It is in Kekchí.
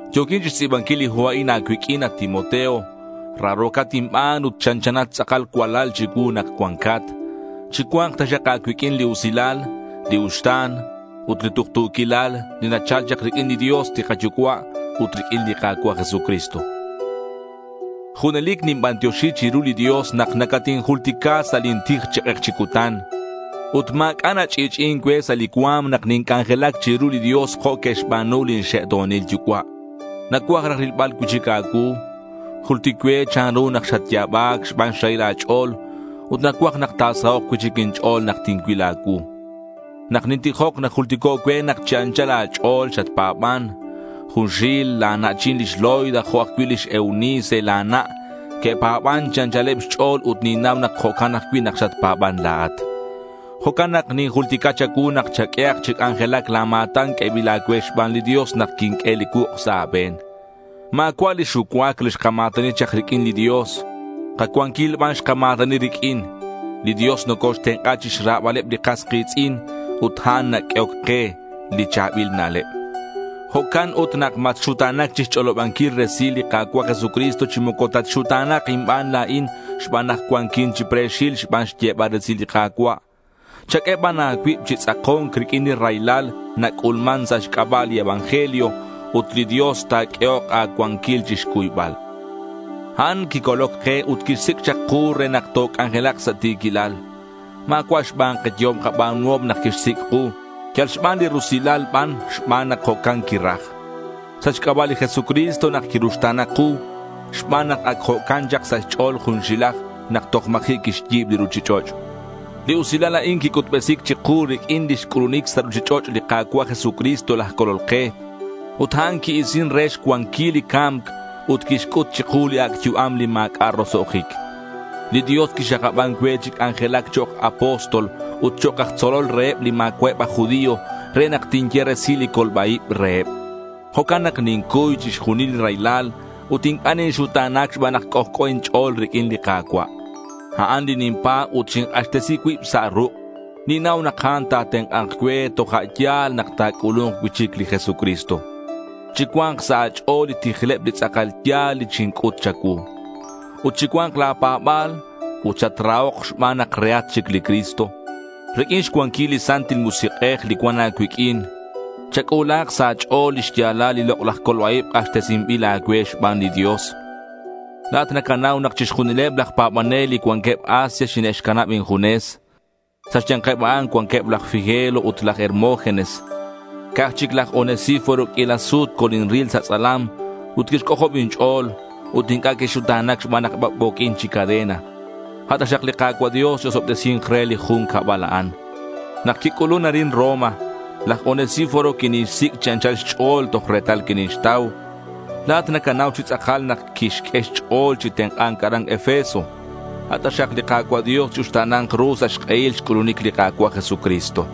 Yo̱quin chixtz'i̱banquil li hu a'in a̱cuiq'uin, at Timoteo. Raro̱cat inban ut chanchanat tz'akal cualal chicuu nak cuancat. Chicua̱nk taxak a̱cuiq'uin li usilal, li uxta̱n, ut li tuktu̱quilal, li nachal chak riq'uin li Dios li kaYucua' ut riq'uin li Ka̱cua' Jesucristo. Junelic ninbantioxi chiru li Dios nak nacatinjultica sa' lin tij chi k'ek chi cutan. Ut ma̱c'a' nach'i'ch'i'in cue sa' li cua̱m nak ninc'anjelac chiru li Dios jo' que'xba̱nu lin xe'to̱nil yucua'. Nacuaj raj rilbal cui'chic a̱cuu. Jultic cue chanru nak xatya̱bac xban xrahil a̱ch'o̱l ut nacuaj nak ta̱sahok' cui'chic inch'o̱l nak tincuil a̱cuu. Nak nintijoc najultico' cue nak chi anchal a̱ch'o̱l xatpa̱ban. Junxil la̱ na'chin lix Loida jo' ajcui' lix Eunice la̱ na' que'pa̱ban chi anchaleb xch'o̱l ut ninnau nak jo'can ajcui' nak xatpa̱ban la̱at. Jo'can nak ninjultica cha̱cuu nak chaq'uehak chi c'anjelac la̱ ma̱tan q'uebil a̱cue xban li Dios nak quinq'ue li cuuk' sa' a̱be̱n. Ma̱cua' li xucuac li xkama̱tani chak riq'uin li Dios. Kacuanquil ban xkama̱tani riq'uin. Li Dios nocoxtenk'a chixrabaleb li kas ki̱tz'in ut a'an naq'uehoc ke li cha̱bil na'leb. Jo'can ut nak matxuta̱nac chixch'olobanquil resil li Ka̱cua' Jesucristo chi moco tatxuta̱na̱k inban la̱in xban nak cuanquin chi pre̱xil xban xyebal resil li Ka̱cua'. Chaq'ue ban a̱cuib chi tz'ako̱nc riq'uin li raylal nac'ulman sa' xc'aba' li evangelio. Ut li Dios ta̱q'uehok a̱cuanquil chixcuybal. A'an quicoloc ke ut quixsic' chak ku re nak toc'anjelak sa' ti̱quilal. Ma̱cua' xban kayehom kaba̱nuhom nak quixsic' ku. Yal xban li rusilal ban, xban nak jo'can quiraj. Sa' xc'aba' li Jesucristo nak quiruxta̱na ku, xban nak ac jo'can chak sa' xch'o̱l junxilaj nak toj ma̱ji' quixyi̱b li ruchich'och'. Li usilal a'in quic'utbesi̱c chiku riq'uin lix c'ulunic sa' ruchich'och' li Ka̱cua' Jesucristo laj Colol ke. Ut a'an qui-isin re xcuanquil li ca̱mc ut quixc'ut chiku li ac' yu'am li ma̱c'a' roso'jic. Li Dios quixakaban cue chi c'anjelac chok' apóstol ut chok' aj tzolol reheb li ma̱cua'eb aj judío re nak tinye resil li colba-ib reheb. Jo'can nak nincuy chixjunil li raylal ut inc'a' ninxuta̱nac xban nak c'ojc'o inch'o̱l riq'uin li Ka̱cua'. A'an li ninpa̱b ut xink'axtesi cuib sa' ruk'. Ninnau nak a'an ta̱tenk'a̱nk cue toja' yal nak ta̱c'ulu̱nk cui'chic li Jesucristo. Chicua̱nk sa' a̱ch'o̱l li tijleb li tz'akal ya̱l li xinc'ut cha̱cuu. Ut chicua̱nk la̱ pa̱ba̱l ut chatrahok xban nak rehat chic li Cristo. Riq'uin xcuanquil li Santil Musik'ej li cuan a̱cuiq'uin, chac'ulahak sa' a̱ch'o̱l li xya̱lal li lok'laj colba-ib k'axtesinbil a̱cue xban li Dios. La̱at nacanau nak chixjunileb laj pa̱banel li cuanqueb Asia xine'xcanab injunes. Sa' xya̱nkeb a'an cuanqueb laj Figelo ut laj Hermógenes. Ca'aj chic laj Onesíforo q'uila sut colinril sa' tz'alam ut quixc'ojob inch'o̱l ut inc'a' quixuta̱nac xban nak bac'bo̱quin chi cadena. A' taxak li Ka̱cua' Dios chi-osobtesi̱nk re li jun cabal a'an. Nak quic'ulun arin Roma, laj Onesíforo quinixsic' chi anchal xch'o̱l toj retal quinixtau. La̱at nacanau chi tz'akal nak quixq'ue xch'o̱l chi tenk'a̱nc aran Efeso. A' taxak li Ka̱cua' Dios chi-uxta̱na̱nk ru sa' xk'ehil xc'ulunic li Ka̱cua' Jesucristo.